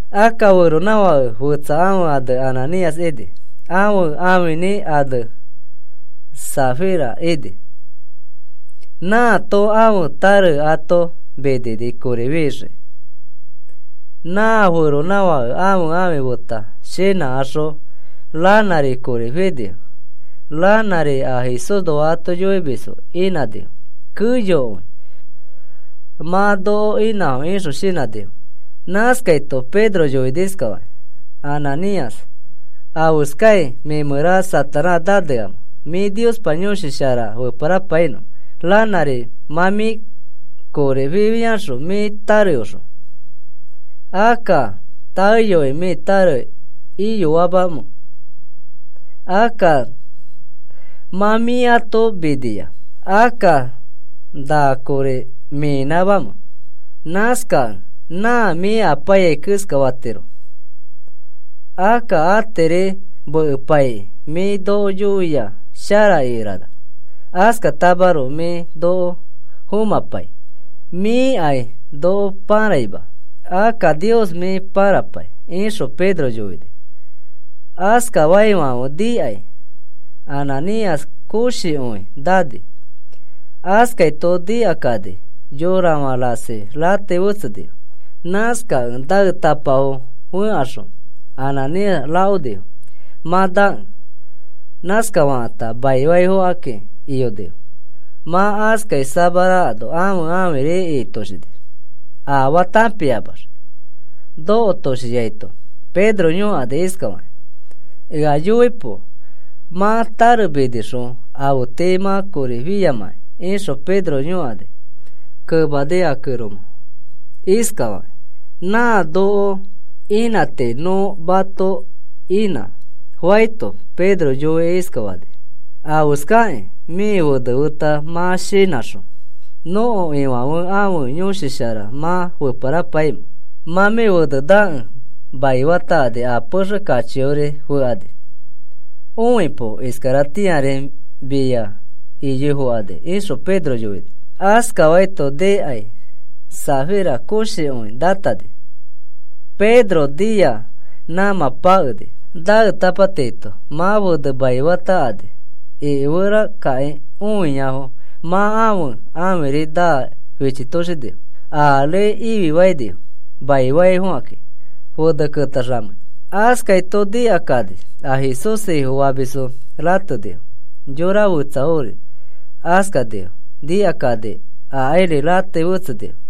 Akka feronãfake fetsa ãfe ane Ananías ini. Ãfe ãfinĩ ane Safira ini. Nãato ãfe tare ato minini kori fixii. Nã feronãfake ãfe ãfi feta shinãkaxõ ranãri kori finifo. Ranãri a Jesúsnoa ato yoimisfo inãnifo keyokõi mã noko inãfo ixõ shinãnõfo. Nãskaito Pedro yoini iskafakĩ: “Ananías, ¿afeskai mĩ mẽra Satanás naneamẽ mĩ Niospa Yõshi Shara feparapainõ ranãri mã mĩ kori fifiaxõ mĩ tareõxõ? Akka, ¿taeyoi mĩ tare iyoamamẽ? Akka mã mĩ ato minia, akka, ¿na kori mĩnãmamẽ? Nãskakẽ nã mĩ apaiyai keskafatiro. Akka atiri mekepaikĩ mĩ noko yoia shara ikerana. Askatamaroko mĩ noko fomãpai. Mĩkai noko pãraima, akka Nios mĩ pãrapai,” ixõ Pedro yoini. Askafaifãfe nikai Ananías koshikõi nani. Askaito nikakani yorafã rasi ratei fetsenifo. Nãskakẽ naetapafo fẽkaxõ Ananías rakonifo mã nakẽ. Nãskafakãta maifaifokakĩ iyonifo. Mã askai samarakano ãfe ãfiri ikitoshini, afaa tãpiamax. Nokotoshiaito Pedro yõkani iskafakĩ: “Ea yoipo mã tare minixõ afe tii mã kori fiamãki,” ixõ Pedro yõkani. Kemani a kẽroma iskafakĩ: “Nã noko inã tii nõ mato inã,” faito, Pedro yoikĩ iskafani: “¿Afeskakĩ mĩ fene feta mã shinãxõ nõko Ifãfe ãfe Yõshi Shara mã feparapaimẽ? Mã mĩ fene nakẽ maifatakani a pexe kachiori fekani. Õipo, iskaratĩari mia iyoi fokani,” ixõ Pedro yoini. Askafaito nikai Safira koshikõi nãtani. Pedro nia nãmã pakeni. Naetapa tiito mã fene maifatakani ikiferakakĩ õiafo mã ãfe ãfiri naa fichitoshinifo. Ari ififainifo maifaifokakĩ, fene ketaxamei. Askaito nikakani a Jesús Ifofamisfo ratenifo. Yora fetsafori askanifo nikakani akairi ratei fetsenifo.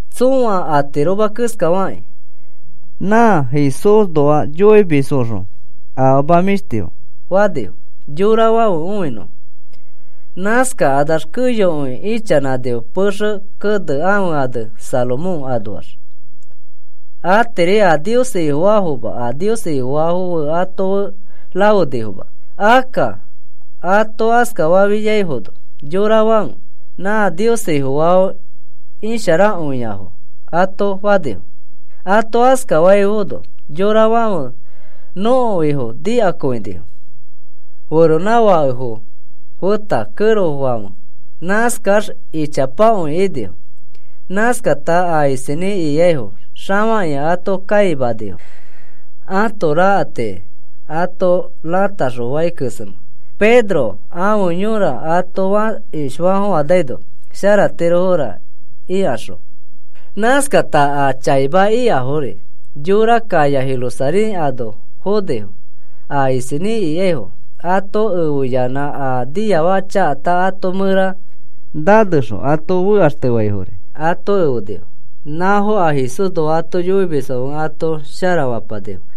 Tsõa atiroma keskafakĩ nã Jesúsnoa yoimisfoõxõ afama mĩshtifo fanifo yorafãfe õinõfo. Nãskakanax keyokõi ichanãnifo pexe kene ãfe ane Salomón anoax. Atiri a Nios Ifofaafoma a Nios Ifofaafo fe ato fe rafenifoma. Akka ato askafafiaifono yorafãfe, “Na Nios Ifofaafo isharakõiafo,” ato fanifo. Ato askaifaifono yorafãfe nõko Ifo nikakõinifo, feronãfakefo feta kẽrofãfe. Nãskax ichapakõi inifo. Nãskakata a isinĩ ikaifo xafakĩa ato kãimanifo ãto rakatiki ato ratakaxõ fãi kesemẽ, “Pedro ãfe yõra ato fakish faafofãnaino sharatirofora,” ikaxõ. Nãskakata a chaima ikafori yora kaya Jerusalén ano fonifo. A isinĩ ikaifo ato efeyanã a niafaka chakata ato mẽra nanexõ ato fekaxtefaifori ato efenifo. Nãfo a Jesúsnoa ato yoimisfãfe ato sharafapanifo.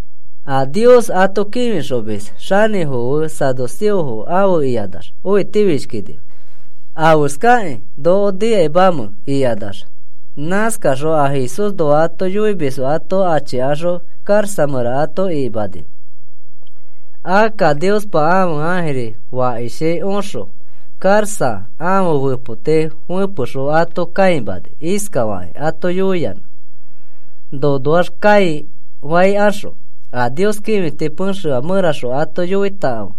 A Nios ato kĩfixomis xanĩfo fe saduceofo afe ikanax õitifishkinifo, afeskakĩ noko nikakanimamẽ ikanax. Nãskakaxõ a Jesúsnoa ato yoimisfo ato achikaxõ karaxa mẽra ato ikimanifo. Akka Niospa ãfe ãjiri fakishi oxõ karaxa ãfe fepoti fepexõ ato kãimani iskafakĩ ato yoiyanã: “Nonoax kãifaikaxõ a Nios kĩfiti pexefã mẽraxõ ato yoitakãfe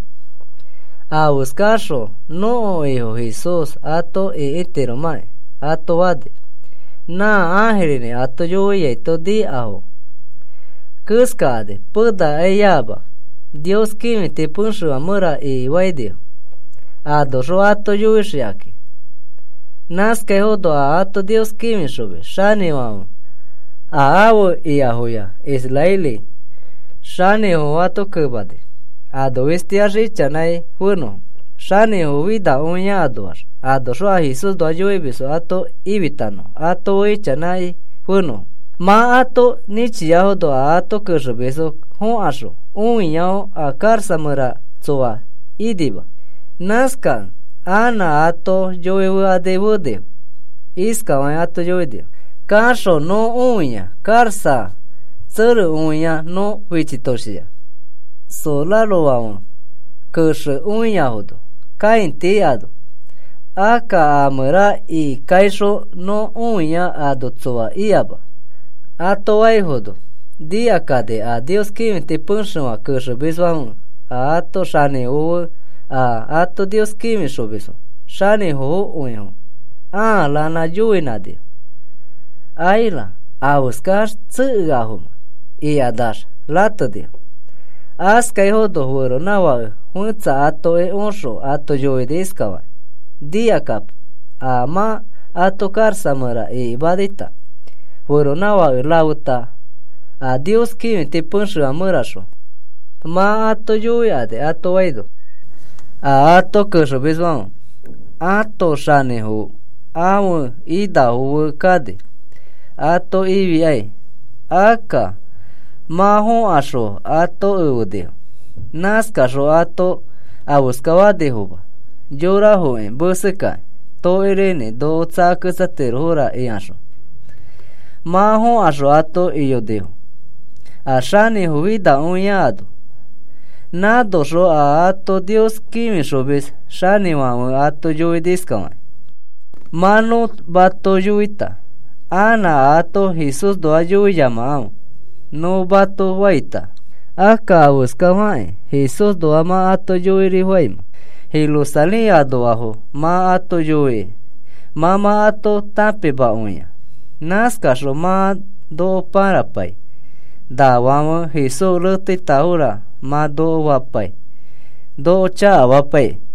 afeskaxõ nõko Ifo Jesús ato ĩkitiromãkĩ,” ato fani. Nã ãjirinĩ ato yoiaito nikafo keskakani penakaiama Nios kĩfiti pexefã mẽra ikifainifo, anoxõ ato yoixikakĩ. Nãskaifono a ato Nios kĩfixomis xanĩfãfe, a afe ikafoya israeli xanĩfofo ato kenani, ano fistiax ichanãi fenõfo xanĩfo finakõia anoax, anoxõ a Jesúsnoa yoimisfo ato ifitanõfo ato fe ichanãi fenõfo. Mã ato nĩchiafono a ato kexemisfo fokaxõ õiafo a karaxa mẽra tsoa inima. Nãskakẽ anã ato yoifekani fenifo. Iskafakĩ ato yoinifo: “Kaxõ nõ õia karaxa fetaoxikõina nõ fichitoshia, sorarofãfe kexekõiafono kãiti ano. Akka a mẽra ikikaixõ nõ õia ano tsoa ikama,” ato faifono, nikakani a Nios kĩfiti pexefã kexemisfãfe a ato xanĩfofo fe, a ato Nios kĩfixomisfo xanĩfokõifo ãa ranã yoinãnifo: “¡Aira! ¿Afeskax tsekeafomẽ?” ikanax ratenifo. Askaifono feronãfake fetsa atoki oxõ ato yoini iskafakĩ: “Nikakapo a mã ato karaxa mẽra ikimanita feronãfake rafeta, a Nios kĩfiti pexefã mẽraxõ mã ato yoikani,” ato faino, a ato kexemisfãfe ãto xanĩfo ãfe inafo fe kani ato ifikai. Akka mã fokaxõ ato efenifo. Nãskaxõ ato afeska fanifoma yorafoki mesekakĩ tokirinĩ noko tsakatirofora ikaxõ. Mã fokaxõ ato iyonifo a xanĩfo finakõia ano. Nãnoxõ a ato Nios kĩfixomis xanĩfãfe ato yoini iskafakĩ: “Mã nõ mato yoita, ‘Anã ato Jesúsnoa yoiyamakãfe,’ nõ mato faita, akka, ¿afeskakĩ Jesúsnoa mã ato yoirifaimẽ? Jerusalén anoafo mã ato yoiki mã mã ato tãpimakõia. Nãskaxõ mã noko pãrapai nafãfe Jesús reteitafora mã noko fapai, noko chakafapaikĩ.”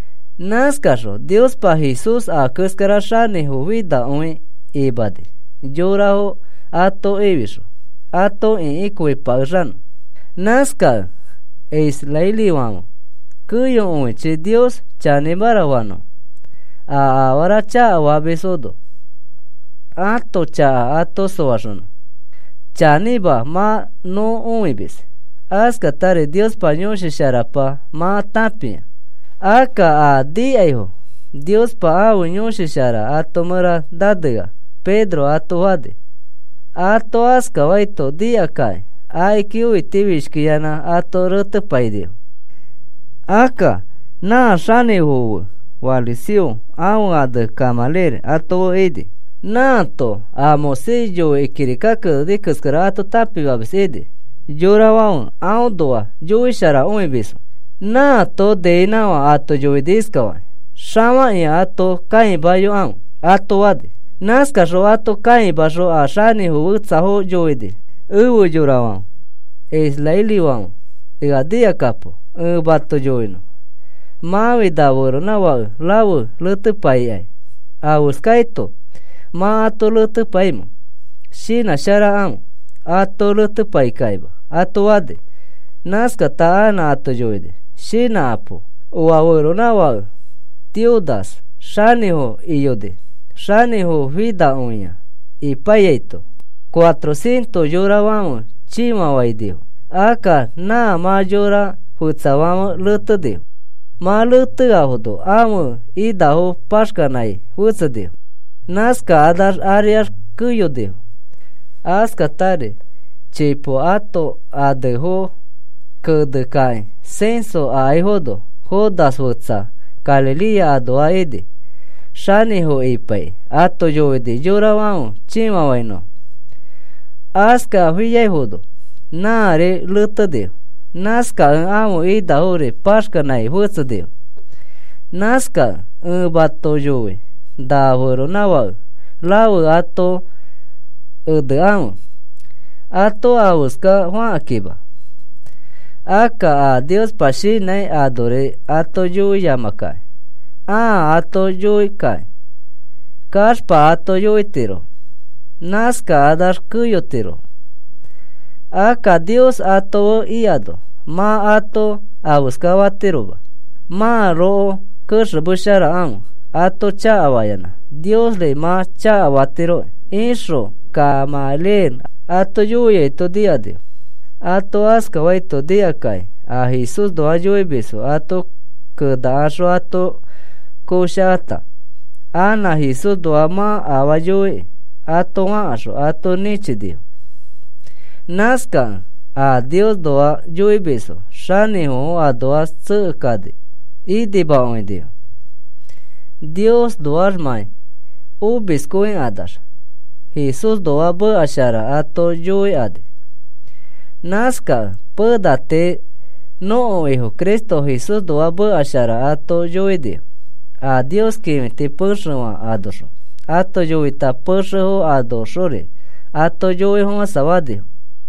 Nãskaxõ Niospa Jesús a keskara xanĩfofinakõi imani yorafo ato ifixõ ato ĩkikõipakexanõ. Nãskakẽ israelifãfe keyokõichi Nios chanĩmara fanõfo, a afara chakafamisfono ãto chaka ato soaxonõ. Chanĩma mã nõ õimis, askatari Niospa Yõshi Sharapa mã tãpia. Akka a nikaifo Niospa ãfe Yõshi Shara ato mẽra nanea,” Pedro ato fani. Ato askafaito nikakakĩ akiki õitifishkiyanã ato retepainifo. Akka nã xanĩfofo fe fariseo ãfe ane Gamaliel ato fe ini. Nãato a Moisés yoikĩ kirika keneni keskara ato tãpimamis ini. Yorafãfe aõnoa yoisharakõimisfo. Nãato niinãkafã ato yoini iskafakĩ: “Xafakĩa ato kãimayokãfe,” ato fani. Nãskaxõ ato kãimaxõ a xanĩfo fetsafo yoini: “Efe yorafãfe israelifãfe, ea nikakapo ẽ mato yoinõ. Mãfi na feronãfake rafe retepaikãi, ¿afeskaito mã ato retepaimẽ? Shinãsharakãfe. Ato retepaikakĩma,” ato fani. Nãskata anã ato yoini: “Shinãkapo, oa feronãfake Teudas xanĩfo iyoni. Xanĩfo finakõia ipaiyaito cuatro cientos yorafãfe chĩfafainifo. Akka nã mã yora fetsafãfe retenifo. Mã reteafono ãfe inafo paxkanãi fetsenifo. Nãskakanax ariax keyonifo. Askatari chipo ãto anefo kenekakĩ censo akaifono, Judas fetsa. Galilea anoa ini. Xanĩfo ipaikĩ ato yoini yorafãfe chĩfafãinõfo. Askafafiaino nãri retenifo. Nãskakẽ ãfe inafori paxkanãi fetsenifo. Nãskakẽ ẽ mato yoi na feronãfake rafe ato enekãfe ato afeska fakakĩma. Akka a Niospa shinãi anori ato yoiyamakakĩ, ãa ato yoikakĩ kaxpa ato yoitirofo. Nãskakanax keyotirofo. Akka Nios ato fe ikano mã ato afeska fatiroma. Mãroko kexemesharakãfe ato chakafayanã Niosri mã chakafatiroki,” ixõ Gamaliel ato yoiaito nikanifo. Ato askafaito nikakakĩ, a Jesúsnoa yoimisfo ato kenakaxõ ato koshakata, “Anã Jesúsxõ mã afaa yoiki,” ato fakaxõ ato nĩchinifo. Nãskakẽ a Niosnoa yoimisfo xanĩfofo anoax tsekekani inimakõinifo, Niosnoaxmãi omiskõikanax Jesúsnoa meka shara ato yoikani. Nãskakẽ pena tii nõko Ifo Cristo Jesúsnoa meka shara ato yoinifo. A Nios kĩfiti pexefã anoxõ ato yoita pexefo anoxori ato yoifofãsafanifo.